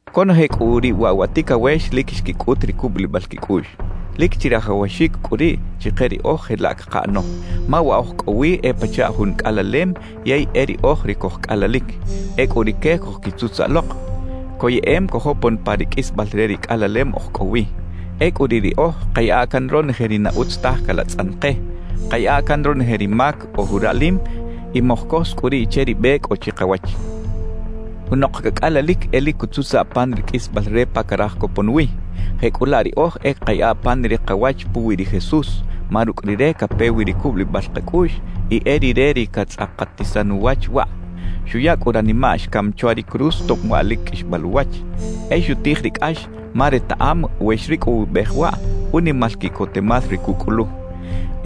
Conoje cꞌu riꞌ waꞌ wa ticawex lic xquicꞌut ri cubulibal quicꞌuꞌx. Lic chirajawaxic cꞌu riꞌ chike riꞌoj jelaꞌ cakaꞌano. Ma wa oj cꞌo wi e pachaꞌ jun cꞌalalem yey e riꞌoj ri cojcꞌalalic. Ecꞌu rique cojquitzutzaꞌ lok, coyeꞌem cojopon pa ri qꞌuisbal re ri cꞌalalem oj cꞌo wi. Ecꞌu riꞌ riꞌoj kayaꞌa can ronoje ri na utz taj calatzꞌan ke, kayaꞌa can ronoje ri mac ojuraꞌlim y mojcos cꞌu riꞌ che ri be cꞌo chikawach. Junok cacꞌalalic e lic cutzutzaꞌ pan ri qꞌuisbal re pa caraj copon wi. Jecꞌulaꞌ riꞌoj e kayaꞌa pan ri kawach puwi ri Jesús, ma rucꞌ Rire cape wi ri cubulibal kacꞌuꞌx y e Rire ri catzꞌakatisan uwach waꞌ. Xuya cꞌu ranimaꞌ xcam chwa ri cruz tob waꞌ lic qꞌuixbal uwach; e xutij ri cꞌax ma retaꞌam we xricꞌowibej waꞌ, unimal quiꞌcotemal ri cucꞌulu.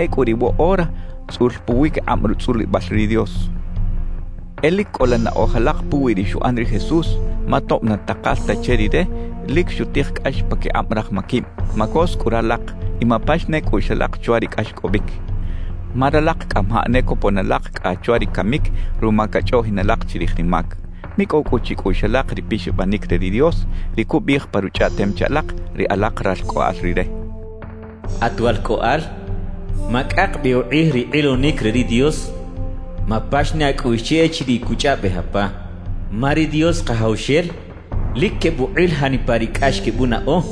Ecꞌu riꞌ woꞌora tzꞌul puwiquikꞌab rutzꞌulibal ri Dios. E lic cꞌola naꞌoj alak puwi ri xuꞌan ri Jesús; ma tob na takal ta che Rire, lic xutij cꞌax paquikꞌab raj maquib. Macos cꞌu ralak y mapax ne cꞌuꞌx alak chwa ri cꞌaxcꞌobic. Ma ralak cꞌamajaꞌ ne copon alak cꞌa chwa ri camic ruma cachꞌoꞌjin alak chirij ri mac. Micꞌow cꞌu chicꞌuꞌx alak ri pixabanic re ri Dios, ri cubiꞌij pa Ruchꞌaꞌtem che alak, ri alak ralcꞌoꞌal Rire: At walcꞌoꞌal, macꞌak bi ukꞌij ri kꞌilonic re ri Dios, mapax ne acꞌuꞌx che echiriꞌ cuchꞌaꞌbej apa. Ma ri Dios Kajawxel lic quebukꞌil janipa ri cꞌax quebunaꞌo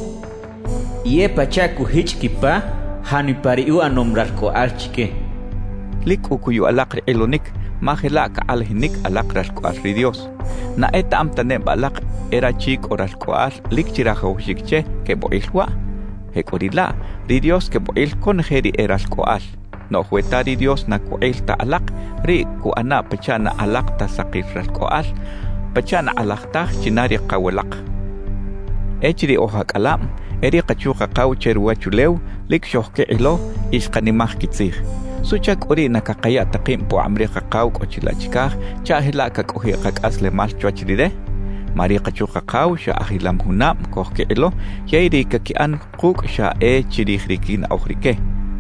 y e pachaꞌ cujichꞌ quipa janipa ri uꞌanom ralcꞌoꞌal chique cachaꞌ. Lic cꞌu cuyu alak ri kꞌilonic, ma jelaꞌ cakꞌalajinic alak ralcꞌoꞌal ri Dios. ¿Na etaꞌam ta neba alak e rachi cꞌo ralcꞌoꞌal lic chirajawaxic che quebukꞌil waꞌ? Jecꞌuriꞌlaꞌ, ri Dios quebukꞌil conoje ri e ralcꞌoꞌal. Noꞌj we ta ri Dios na cukꞌil ta alak, riꞌ cuꞌana pachaꞌ na alak ta sakil ralcꞌoꞌal, pachaꞌ na kꞌalaj taj china ri kaw alak. Echiriꞌ oj acꞌalab, e ri kachu-kakaw che ruwachulew lic xojquikꞌilo y xkanimaj quitzij. ¿Suꞌchac cꞌu riꞌ na cakaya ta kib pukꞌab ri Kakaw cꞌo chilaꞌ chicaj chaꞌ jelaꞌ cacꞌojiꞌ kacꞌaslemal chwach Rire? Ma ri kachu-kakaw xa ajilam junab cojquikꞌilo, yey ri caquiꞌan kucꞌ xa e chirij ri quinaꞌoj rique.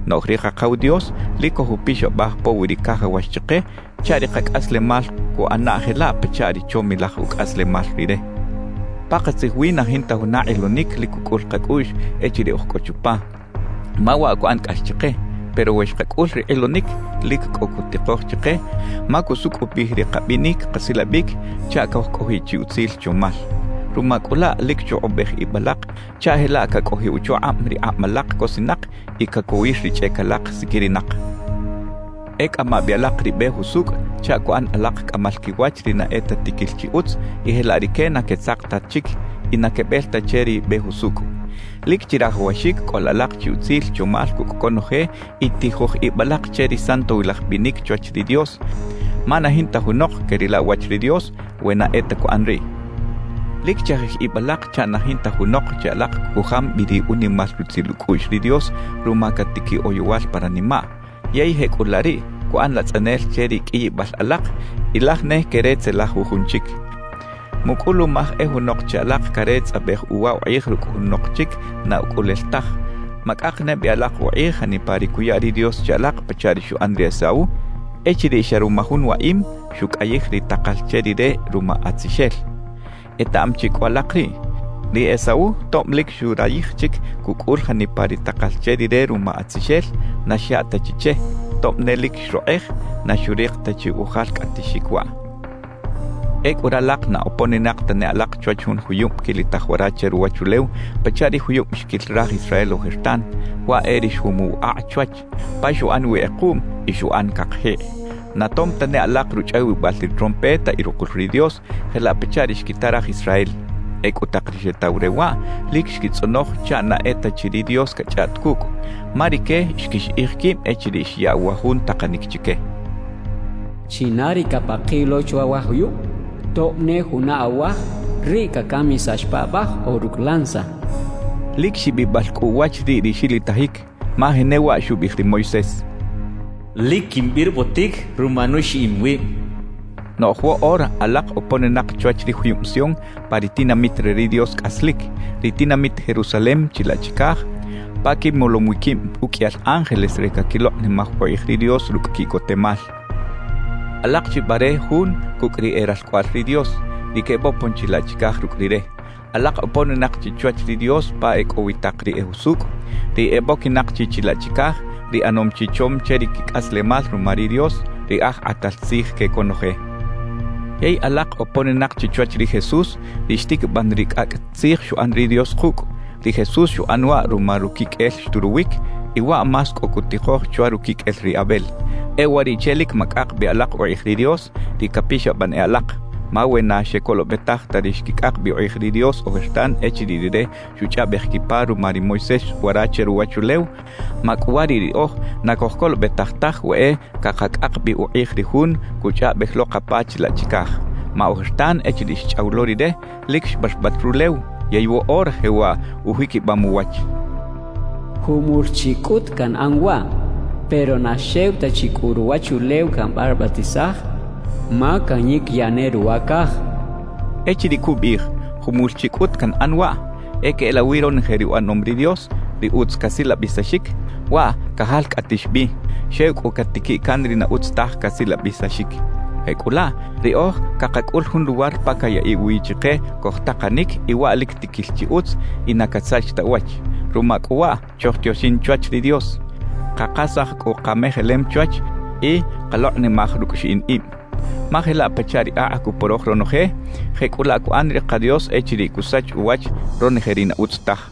Noꞌj ri Kakaw Dios lic cojupixabaj puwi ri cajawax chike chaꞌ ri kacꞌaslemal cuꞌana jelaꞌ pachaꞌ ri chomilaj ucꞌaslemal Rire. Pakatzij wi na jinta juna kꞌilonic lic cucꞌul kacꞌuꞌx echiriꞌ oj cꞌo chupa, ma waꞌ cuꞌan cꞌax chike. Pero we xkacꞌul ri kꞌilonic, lic cꞌo cutikoj chike, ma cusucꞌupij ri kabinic kasilabic chaꞌ cojcꞌojiꞌ chi utzil chomal. Ruma cꞌu laꞌ lic chukꞌubej ib alak chaꞌ jelaꞌ cacꞌojiꞌ uchukꞌab ri kꞌab alak cosinak y cacowir ri chꞌec alak siquirinak. E cꞌama bi alak ri be jusucꞌ chaꞌ cuꞌan alak cꞌamal quiwach ri na e ta tiquil chi utz y jelaꞌ rique na quetzak ta chic y na quebel ta che ri be jusucꞌ. Lic chirajawaxic cꞌola alak chi utzil chomal cucꞌ conoje y tijoj ib alak che ri santowilaj binic chwach ri Dios, ma na jinta junok queꞌrila uwach ri Dios we na e ta cuꞌan riꞌ. Lic chajij ib alak chaꞌ na jinta junok che alak cujam bi ri unimal rutzil ucꞌuꞌx ri Dios ruma catiquiꞌ oyowal pa ranimaꞌ, yey jecꞌulaꞌ riꞌ cuꞌan latzꞌanel che ri qꞌuiyibal alak y laj ne queretzelaj jujun chic. Mucꞌulumaj e junok che alak caretzꞌabej uwa ukꞌij rucꞌ junok chic na ucꞌulel taj; macꞌak ne bi alak ukꞌij janipa ri cuya ri Dios che alak pachaꞌ ri xuꞌan ri Esaú echiriꞌ xa ruma jun waꞌim, xucꞌayij ri takal che rire ruma atzixel. Etaꞌam chi cꞌu alak riꞌ, ri Esaú tob lic xurayij chic cucꞌul janipa ri takal che rire ruma atzixel, na xyaꞌ ta chi che; tob ne lic xrokꞌej, na xurik ta chi ujalcꞌatixic waꞌ. Ecꞌu ralak na oponinak tane alak chwach jun juyub quilitaj wara che ruwachulew pachaꞌ ri juyub xquil raj Israel ojertan, waꞌ e ri xjumuw akꞌ chwach, pa xuꞌan wi kꞌekuꞌm y xuꞌan cakjikꞌ. Na tom tane alak ruchꞌawibal ri trompeta y rukul ri Dios jelaꞌ pachaꞌ ri xquita raj Israel. Ecꞌu tak ri xetaw re waꞌ, lic xquitzꞌonoj chaꞌ na e ta chi ri Dios cachꞌaꞌt cucꞌ. Ma rique xquixiꞌij quib echiriꞌ xyaꞌ wa jun takanic chique: «China ri capakiꞌ lo chwa wa juyub, tob ne juna awaj, riꞌ cacamisax paꞌbaj o rucꞌ lanza» xchaꞌ. Lic xibibal cꞌu uwach riꞌ ri xilitajic, ma jenewaꞌ xubiꞌij ri Moisés: «Lic quimbirbotic ruma nuxiꞌim wib» xchaꞌ. Noꞌj woꞌora alak oponinak chwach ri juyub Sion pa ri tinamit re ri Dios cꞌaslic, ri tinamit Jerusalem chilaꞌ chicaj, pa quimolom wi quib uqꞌuiyal ángeles re caquilokꞌnimaj ukꞌij ri Dios rucꞌ quiꞌcotemal. Alak chi bare jun cucꞌ ri e ralcꞌoꞌal ri Dios, ri quebopon chilaꞌ chicaj rucꞌ Rire. Alak oponinak chi chwach ri Dios pa e cꞌo wi tak ri e jusucꞌ, ri eboquinak chi chilaꞌ chicaj, ri ꞌanom chi chom che ri quicꞌaslemal ruma ri Dios, ri Aj Kꞌatal Tzij que conoje. Yey alak oponinak chi chwach ri Jesús, ri xtiquiban ri cꞌacꞌ tzij xuꞌan ri Dios kucꞌ; ri Jesús xuꞌan waꞌ ruma ruquiqꞌuel xturuwic, y waꞌ más cꞌo cutikoj chwa ruquiqꞌuel ri Abel. E uwariꞌche lic macꞌak bi alak ukꞌij ri Dios, ri capixaban e alak. Ma we na xecolobetaj ta ri xquicꞌak bi ukꞌij ri Dios ojertan echiriꞌ Rire xuchꞌaꞌbej quipa ruma ri Moisés wara che ruwachulew, macꞌuwariꞌ riꞌoj na cojcolobetaj taj we e cakacꞌak bi ukꞌij ri Jun cuchꞌaꞌbej lo kapa chilaꞌ chicaj. Ma ojertan echiriꞌ xchꞌaw lo Rire, lic xbarbat rulew, yey woꞌora jewaꞌ ujiquibam uwach: Jumul chi cꞌut canꞌan waꞌ, pero na xew ta chi cꞌu ruwachulew cambarbatisaj, ma canyiquiyaꞌ ne ruwa caj cachaꞌ. Echiriꞌ cubiꞌij: «Jumul chi cꞌut canꞌan waꞌ,» e queꞌelawi ronoje ri uꞌanom ri Dios, ri utz casilabisaxic, waꞌ cajalcꞌatix bi; xew cꞌu catiquiꞌ can ri na utz taj casilabisaxic. Jecꞌulaꞌ, riꞌoj cakacꞌul jun luwar pa cayaꞌiꞌ wi chike cojtakanic y waꞌ lic tiquil chi utz y na casach ta uwach. Ruma cꞌu waꞌ chojtioxin chwach ri Dios, kakasaj cꞌu kamejelem chwach y kalokꞌnimaj rucꞌ xiꞌin ib. Ma jelaꞌ pachaꞌ ri akꞌ cuporoj ronoje, jecꞌulaꞌ cuꞌan ri ka Dios echiriꞌ cusach uwach ronoje ri na utz taj.